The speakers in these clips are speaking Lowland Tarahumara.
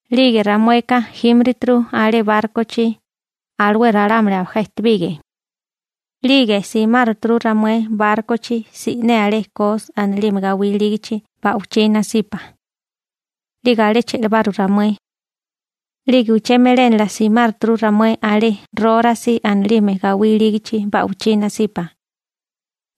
'Lige ramueka jímirituru alé bárkochi, alué ralámuli abajá ejtebige. 'Lige simáruturu ramué bárkochi si'né alé Kos anilime gawí ilígachi ba'wichí nasipa. 'Lige alé che'labaru ramué. 'Lige uché melénala simáruturu ramué alé Rórasi anilime gawí ilígachi ba'wichí nasipa.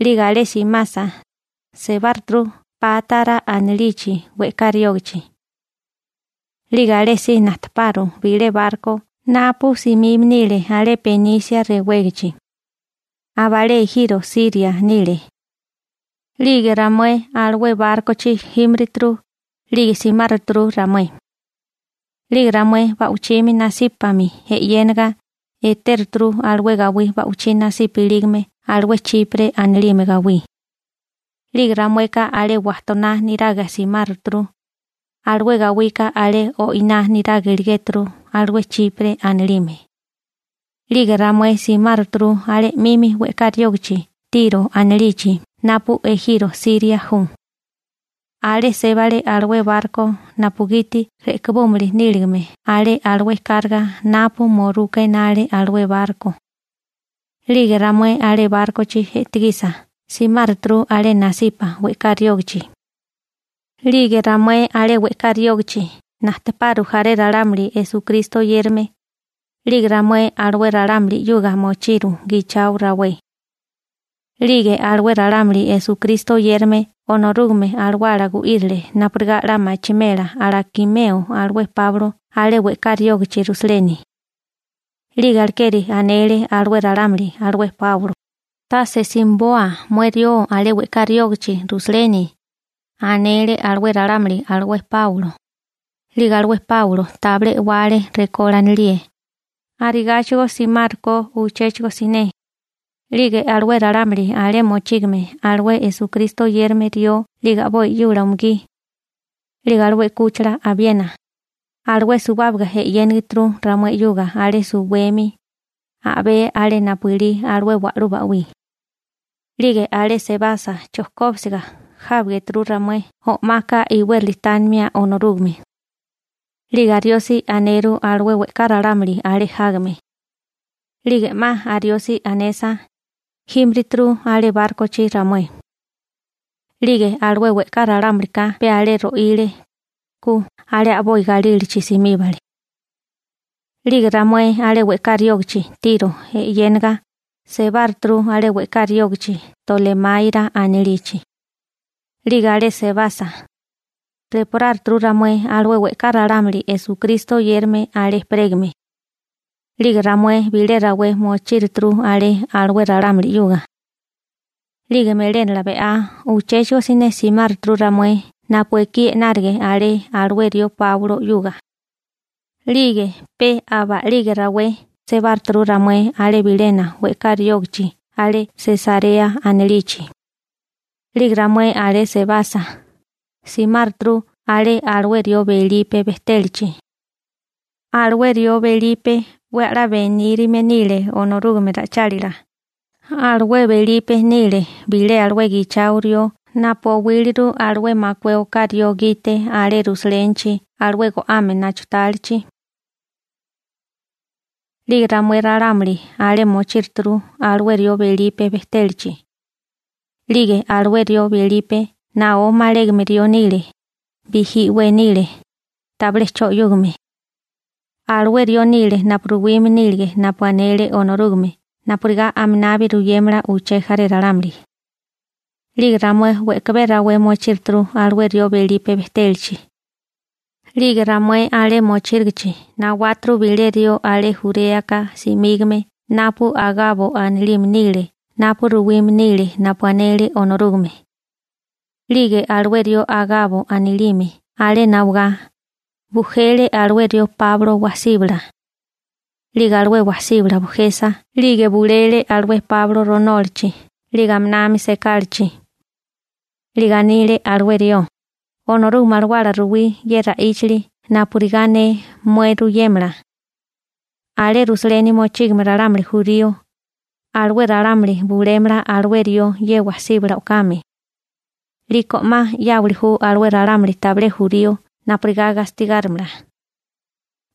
'Lige alé simasa, sebáruturu Pátara anilichi we'ká riógichi. 'Lige alésí najteparu bilé barko napu simime nile alé Benise rewégachi. Abalé ejiro Siria nile. 'Lige ramué alué bárkochi jímirituru, 'lige simáruturu ramué. 'Lige ramué ba'wichimi nasípami e'yénaga etéruturu alué gawí ba'wichí nasipa ilígame alué Chipre anilime gawí. 'Lige ramueka alé wajtoná niraga simáruturu, alué gawika alé o'iná niraga iligéturu alué Chipre anilime. 'Lige ramué simáruturu alé 'mimi we'ká riógichi Tiro anilichi napu ejiro Siria ju. Alé sébale alué barko napugiti re'kibúmili níligame alé alué karga napu muruka enale alué barko. 'Lige ramué alé bárkochi e'tigisa simáruturu alé nasipa we'ká riógichi. 'Lige ramué alé we'ká riógichi najteparu jaré ralámuli Esukristo oyérame. 'Lige ramué alué ralámuli 'yuga mochiru gichao rawé. 'Lige alué ralámuli Esukristo oyérame Onorúgame Alawala gu'írile napurigá 'la machimela alakimeo alué Páulo alé we'ká riógichi Rusaleni. 'Lige alekeri anele alué ralámuli alué Páulo: ―Tase simiboa mué rió alé we'ká riógichi Rusaleni ―anele alué ralámuli alué Páulo. 'Lige alué Páulo tabilé e'wale rekó lánilíe. Arigáchigo simárukó uchéchigo siné. 'Lige alué ralámuli alé mochígame alué Esukristo oyérame rió 'lige a'boi 'yula umugí, 'lige alué 'kúchila abiena, alué suwábaga e'yénigituru ramué 'yuga alé suwemi a'bé alé napu ilí alué wa'lú ba'wí, 'lige alé sebasa chojkóbisiga jábarituru ramué o'maka iwérali tánimia Onorúgame. 'Lige ariosi aneru alué we'ká ralámuli alé jágame. 'Lige 'ma ariosi anesa, jímirituru alé bárkochi ramué. 'Lige alué we'ká ralámulika pe alé ro'ile, ku alé a'boi galílachi simíbale. 'Lige ramué alé we'ká riógichi Tiro e'yénaga, sebáruturu alé we'ká riógichi Tolemáira anilichi. 'Lige alé sebasa, reporáruturu ramué alué we'ká ralámuli Esukristo oyérame alé ejperégame. 'Lige ramué bilé rawé mochíruturu alé alué ralámuli 'yuga. 'Lige melénala be'á uchéchigo siné simáruturu ramué napu ekí e'nárige alé alué rió Páulo 'yuga. 'Lige pe aba a'lige rawé sebáruturu ramué alé bilena we'ká riógichi alé Sesarea anilichi. 'Lige ramué alé sebasa, simáruturu alé alué rió Belipe bejtélachi. Alué rió Belipe 'we a'lá benírime nile Onorúgame ra'ichálila. Alué Belipe nile bilé alué gichao rió napu owíliru alué makué oká rió gite alé Rusalénichi alué go'ame nachutálichi. 'Lige ramué ralámuli alé mochíruturu alué rió Belipe bejtélachi. 'Lige alué rió Belipe naó malégame rió nile, bijí i'wé nile, tabilé 'cho 'yúgame. Alué rió nile napu ruwime nílige napu anele Onorúgame napurigá aminabi ruyémala uché jaré ralámuli. 'Lige ramué we'kabé rawé mochíruturu alué rió Belipe bejtélachi. 'Lige ramué alé mochírigichi nawáturu bilé rió alé Juréaka simígame napu Agabo anilime nile napu ruwime nile napu anele Onorúgame. 'Lige alué rió Agabo anilime alé nawagá, bujele alué rió Páulo wasíbala. 'Lige alué wasíbala bujesa 'lige bulele alué Páulo ronólachi 'lige aminami sekálachi. 'Lige anile alué rió: ―Onorúgame Alawala ruwí ye ra'íchili napurigá ne mué ruyémala: «Alé Rusaleni mochígame ralámuli jurío, alué ralámuli bulémala alué rió ye wasíbala o'kame. 'Liko 'ma 'yáwali ju alué ralámuli tabilé jurío napurigá gastigárimala.»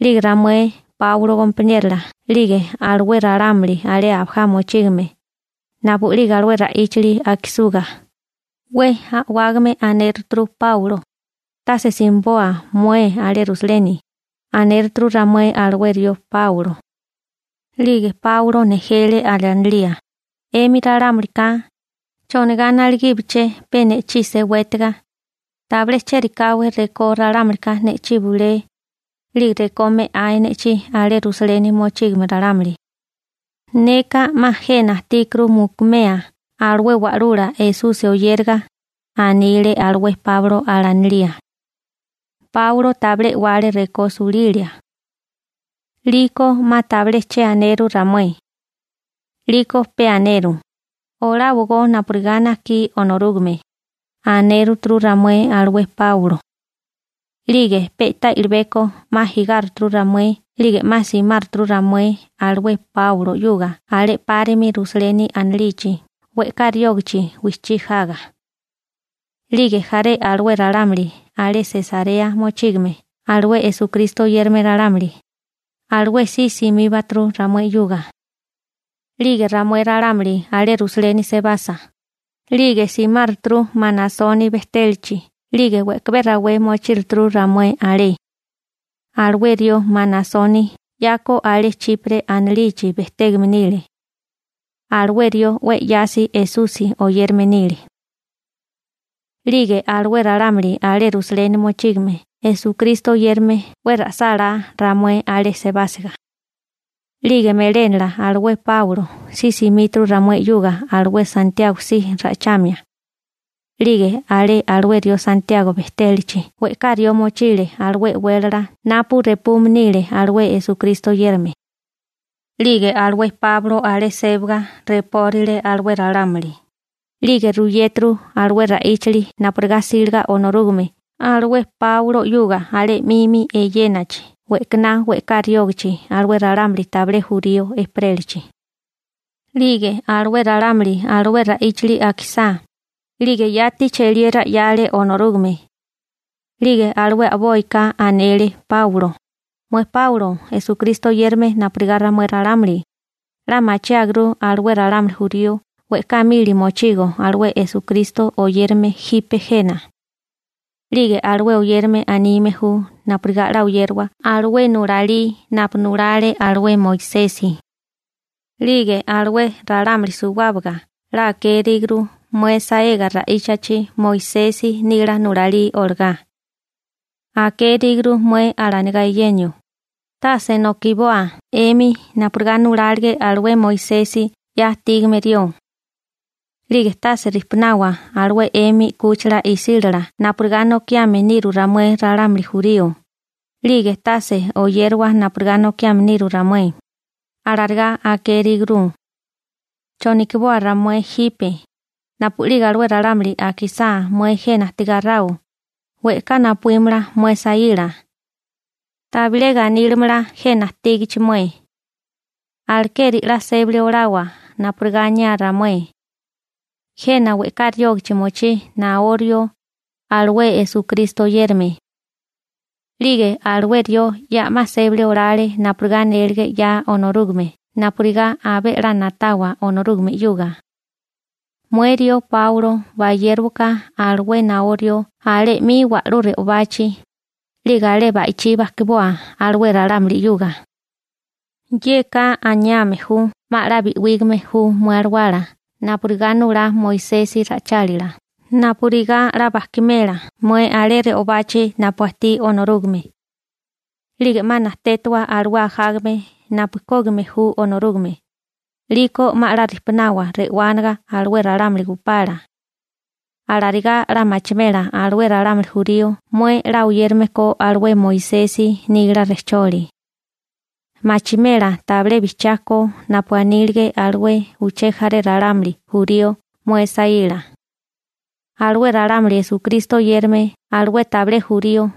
'Lige ramué Páulo gompaniérola 'lige alué ralámuli alé abajá mochígame, napu'lige alué ra'íchali akisuga, 'we a'wágame anéruturu Páulo: ―¡Tase simiboa mué alé Rusaleni! ―anéruturu ramué alué rió Páulo. 'Lige Páulo nejele alanilía: ―'Emi ralámulika, ¿chonigá naligíabaché pe ne'chí sewétigá? Tabilé chérikáwé rekó ralámulika ne'chí bulé, 'lige rekó me'ae ne'chí alé Rusaleni mochígame ralámuli. Neka 'ma jena ajtíkuru mukumea alué Wa'lula Esusi oyériga ―anile alué Páulo alanilía. Páulo tabilé e'wale rekó sulilia. 'Liko 'ma tabilé che aneru ramué. 'Liko pe aneru: ―Oláwogó napurigá najkí Onorúgame ―anéruturu ramué alué Páulo. 'Lige pe'tá i'libeko 'ma jigáruturu ramué 'lige 'ma simáruturu ramué alué Páulo 'yuga alé 'párimi Rusaleni anilichi we'ká riógichi wijchí jaga. 'Lige jaré alué ralámuli alé Sesarea mochígame alué Esukristo oyérame ralámuli, alué si simíbaturu ramué 'yuga. 'Lige ramué ralámuli alé Rusaleni sebasa, 'lige simáruturu Manasoni bejtélachi 'lige we'kabé rawé mochíruturu ramué alé. Alué rió Manasoni 'yako alé Chipre anilichi bejtégame nile. Alué rió 'we 'yasi Esusi oyérame nile. 'Lige alué ralámuli alé Rusaleni mochígame Esukristo oyérame 'we ra'sálá ramué alé sebásiga. 'Lige melénala alué Páulo si simíturu ramué 'yuga alué Santiago si ra'ichamia. 'Lige alé alué rió Santiago bejtélachi we'ká rió mochile alué e'wélala napu repume nile alué Esukristo oyérame. 'Lige alué Páulo alé sébaga repórile alué ralámuli, 'lige ruyéturu alué ra'íchili napurigá 'síliga Onorúgame alué Páulo 'yuga alé 'mimi eyénachi we'kaná we'ká riógichi alué ralámuli tabilé jurío ejperélachi. 'Lige alué ralámuli alué ra'íchili akisá, 'lige yati cheliera 'yale Onorúgame. 'Lige alué a'boika anele Páulo: ―Mué Páulo Esukristo oyérame napurigá ramué ralámuli, 'la machiáguru alué ralámuli jurío we'ká mili mochigo alué Esukristo oyérame jipe jena. 'Lige alué oyérame anime ju napurigá 'la oyérawa alué nulalí napu nulale alué Moisesi. 'Lige alué ralámuli suwábaga 'la akéríguru mué saega ra'íchachi Moisesi nila nulalí olagá. Akéríguru mué alanigá eyenio: «Tase nokiboa 'emi napurigá nulálige alué Moisesi 'ya ajtígame rió, 'lige tase rijpunawa alué 'emi 'kúchila isílala napurigá nokiame niru ramué ralámuli jurío, 'lige tase oyérawa napurigá nokiame niru ramué», alarigá akéríguru. ¿Chonokiboa ramué jipe? Napu'lige alué ralámuli akisá mué jena ajtigáráo, we'ká napuímala mué saíla. Tabilé ganílimala jena ajtígachi mué. Alekeri 'la sébali olawa napurigá aniá ramué. Jena we'ká riógichi mochí naó rió alué Esukristo oyérame. 'Lige alué rió ya'má sébali olale napurigá anélige 'ya Onorúgame napurigá abé 'la na'tawa Onorúgame 'yuga. Mué rió Páulo bayérowaká alué naó rió alé 'mi wa'lú re'obachi, 'lige alé ba'ichí bajkiboa alué ralámuli 'yuga. Yeka aniame ju 'ma 'la bi'wígame ju mué alawala napurigá nulá Moisesi ra'ichálila napurigá 'la bajkimela mué alé re'obachi napu ajtí Onorúgame. 'Lige 'ma najtétawa alué ajágame napu kógime ju Onorúgame, 'liko 'ma 'la rijpunawa re'wániga alué ralámuli gupala. Alarigá 'la machimela alué ralámuli jurío mué 'la oyérame ko alué Moisesi nila rejcholi. Machimela tabilé bijchiá ko napu anílige alué uché jaré ralámuli jurío mué saíla. Alué ralámuli Esukristo oyérame alué tabilé jurío,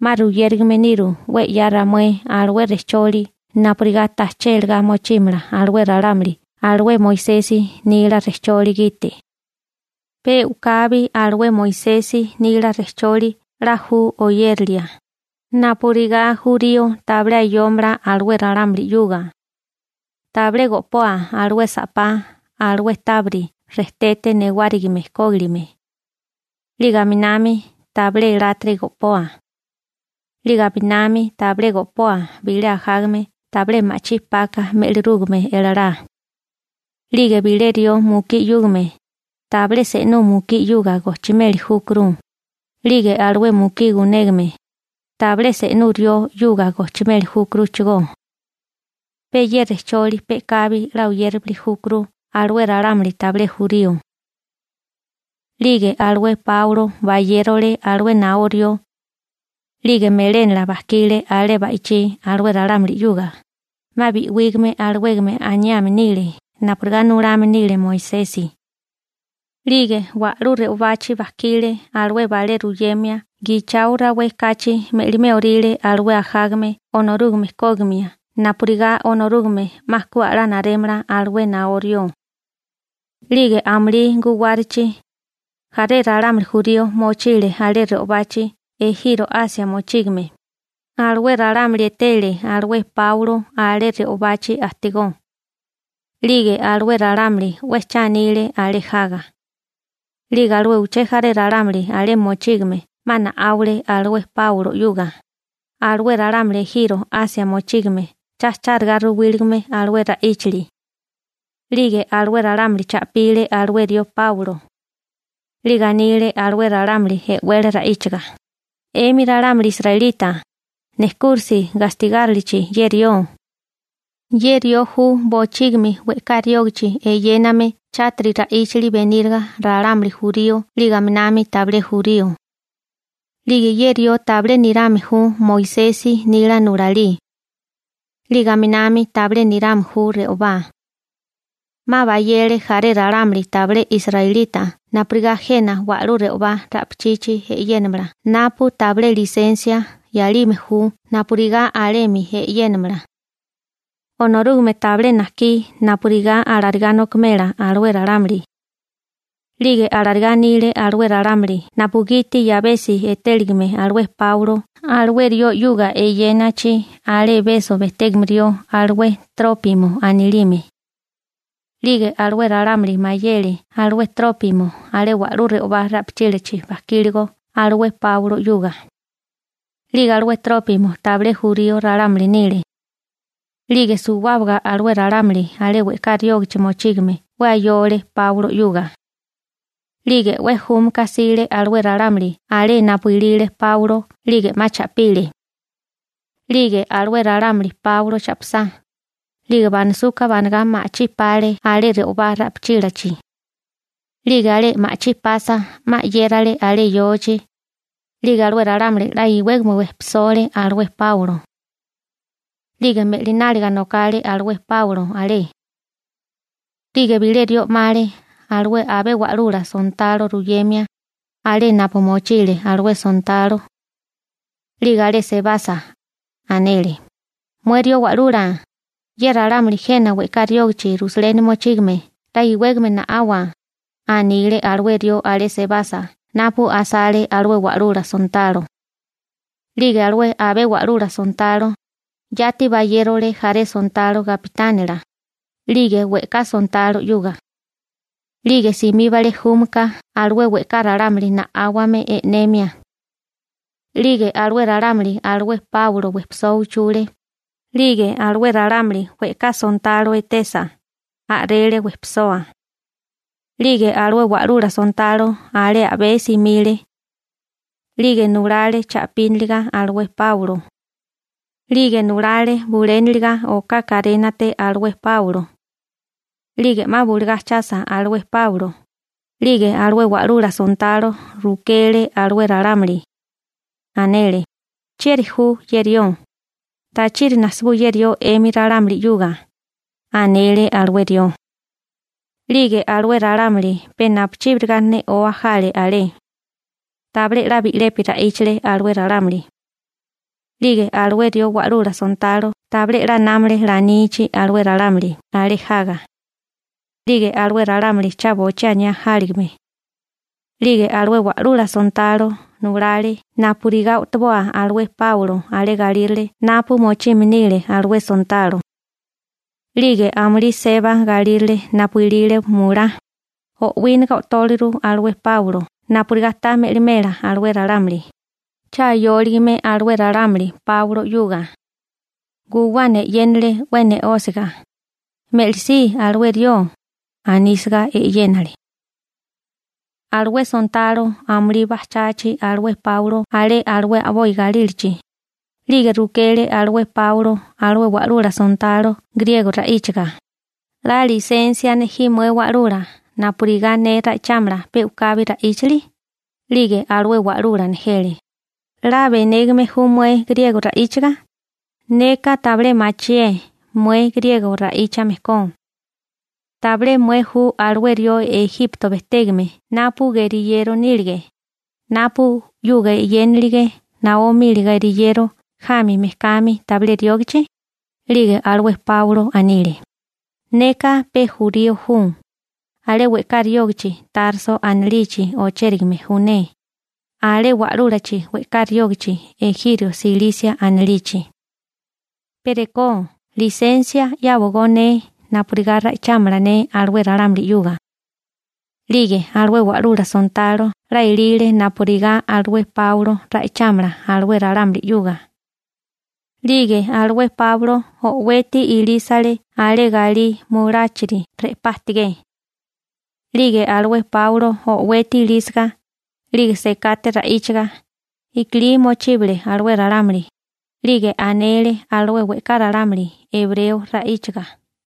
'ma ruyérugame niru 'we 'ya ramué alué rejcholi napurigá tajché lagá mochímala alué ralámuli alué Moisesi nila rejcholi gite. Pe u'kabi alué Moisesi nila rejcholi 'la ju oyérilia, napurigá jurío tabilé ayómala alué ralámuli 'yuga. Tabilé go'poa alué sa'pá alué tábiri rejtete newárigime kógilime. 'Lige aminami tabilé elátiri go'poa. 'Lige aminami tabilé go'poa bilé ajágame tabilé ma'chí paka me'lirúgame elalá. 'Lige bilé rió mukí 'yúgame, tabilé se'nú mukí 'yuga gojchimeli júkuru. 'Lige alué mukí gunégame, tabilé se'nú rió 'yuga gojchimeli júkuruchigó. Pe ye rejcholi pe'kabi 'la oyéramili júkuru alué ralámuli tabilé jurío. 'Lige alué Páulo bayérole alué naó rió. 'Lige melénala bajkile alé ba'ichí alué ralámuli 'yuga, 'ma bi'wígame alawégame aniame nile napurigá nulame nile Moisesi. 'Lige wa'lú re'obachi bajkile alué balé ruyemia gichao rawé kachi me'limé orile alué ajágame Onorúgame kógimia napurigá Onorúgame 'ma ku a'lá narémala alué naó rió. 'Lige amulí guwárachi, jaré ralámuli jurío mochile alé re'obachi ejiro Asia mochígame, alué ralámuli etele alué Páulo alé re'obachi ajtigó. 'Lige alué ralámuli 'we cha anile alé jaga. 'Lige alué uché jaré ralámuli alé mochígame 'ma na'áwale alué Páulo 'yuga, alué ralámuli ejiro Asia mochígame cha chárigá ruwíligame alué ra'íchili. 'Lige alué ralámuli cha'pile alué rió Páulo. 'Lige anile alué ralámuli e'wele ra'íchaga: ―'Emi ralámuli israelita, nejkúrisi gastigárilichi ye rió. Ye rió ju bochígimi we'ká riógichi eyéname chátiri ra'íchali beníriga ralámuli jurío 'lige aminami tabilé jurío. 'Lige ye rió tabilé nirame ju Moisesi nila nulalí. 'Lige aminami tabilé nirame ju re'obá. 'Ma bayele jaré ralámuli tabilé israelita napurigá jena wa'lú re'obá ra'pichila e'yénamala napu tabilé lisensia 'yalime ju napurigá alemi e'yénamala. Onorúgame tabilé najkí napurigá alarigá nokimela alué ralámuli. 'Lige alarigá anile alué ralámuli napugiti 'yabesi etéligame alué Páulo alué rió 'yuga eyénachi alé Ebeso bejtégame rió alué Trópimo anilime. 'Lige alué ralámuli mayele alué Trópimo alé wa'lú re'obá ra'pichílachi bajkíligo alué Páulo 'yuga. 'Lige alué Trópimo tabilé jurío ralámuli nile. 'Lige suwábaga alué ralámuli alé we'ká riógichi mochígame 'we ayole Páulo 'yuga. 'Lige 'we júmaka jsile alué ralámuli alé napu ilile Páulo 'lige 'ma cha'pile. 'Lige alué ralámuli Páulo cha'pisá, 'lige banasuka banagá ma'chí pale alé re'obá ra'pichílachi. 'Lige alé ma'chí pasa, 'ma 'yérale alé yochi. 'Lige alué ralámuli 'la iwégame wejpisole alué Páulo. 'Lige me'lináliga nokale alué Páulo alé. 'Lige bilé rió 'male alué abé wa'lula sontalo ruyemia, alé napu mochile alué sontalo. 'Lige alé sebasa, anele: ―Mué rió wa'lula, ye ralámuli jena we'ká riógichi Rusaleni mochígame 'la iwégame na'awa ―anile alué rió alé sebasa napu asale alué wa'lula sontalo. 'Lige alué abé wa'lula sontalo, yati bayérole jaré sontalo gapitánila, 'lige we'ká sontalo 'yuga. 'Lige simíbale júmika alué we'ká ralámuli na'áwame e'nemia. 'Lige alué ralámuli alué Páulo wejpisoa uchule, 'lige alué ralámuli we'ká sontalo etesa, a'rele wejpisoa. 'Lige alué wa'lula sontalo alé a'bé simile. 'Lige nulale cha'píniliga alué Páulo. 'Lige nulale buléniliga oká karénate alué Páulo. 'Lige 'ma bulugá ajchasa alué Páulo, 'lige alué wa'lula sontalo rukele alué ralámuli. Anele: ―¿Chieri ju ye rió? ¿Tachiri nasibú ye rió 'emi ralámuli 'yuga? ―anele alué rió. 'Lige alué ralámuli pe napuchíbiriga ne'oa jale alé. Tabilé 'la bi'lepi ra'íchale alué ralámuli. 'Lige alué rió wa'lula sontalo tabilé 'la námale lanichi alué ralámuli alé jaga. 'Lige alué ralámuli cha bochí aniá jáligame. 'Lige alué wa'lula sontalo nulale napurigá o'toboa alué Páulo alé galírale napu mochime nile alué sontalo. 'Lige amulí seba galírale napu ilile mulá, o'wíniga o'tóliru alué Páulo napurigá ta me'limela alué ralámuli, cha ayóligame alué ralámuli Páulo 'yuga. Guwana e'yénale 'we ne'ósiga: ―¡Me'lisí alué rió! ―anísiga e'yénale. Alué sontalo amulí bajchachi alué Páulo alé alué a'boi galílachi, 'lige rukele alué Páulo alué wa'lula sontalo griego ra'íchaga: ―¿'La lisensia nejí mué wa'lula napurigá ne ra'ichámala pe u'kabi ra'íchili? 'Lige alué wa'lula nejele: ―'La benégame ju mué griego ra'íchaga, neka tabilé machié mué griego ra'íchame ko. ¿Tabilé mué ju alué rió Ejipto bejtégame napu geriyero nílige, napu 'yuga eyénilige naó mili geriyero jami mejkami tabilé riógachi? 'Lige alué Páulo anile: ―Neka pe jurío ju, alé we'ká riógichi Tarso anilichi ochérigame ju ne, alé wa'lúlachi we'ká riógichi ejiro Silisia anilichi. Pe rekó lisensia 'yáwagó ne napurigá ra'ichámala ne alué ralámuli 'yuga. 'Lige alué wa'lula sontalo 'la elile napurigá alué Páulo ra'ichámala alué ralámuli 'yuga. 'Lige alué Páulo o'weti ilísale alé galí muláchiri re'pá ajtigé. 'Lige alué Páulo o'weti ilísiga, 'lige sekate ra'íchaga, i'kilí mochíbale alué ralámuli, 'lige anele alué we'ká ralámuli ebreo ra'íchaga: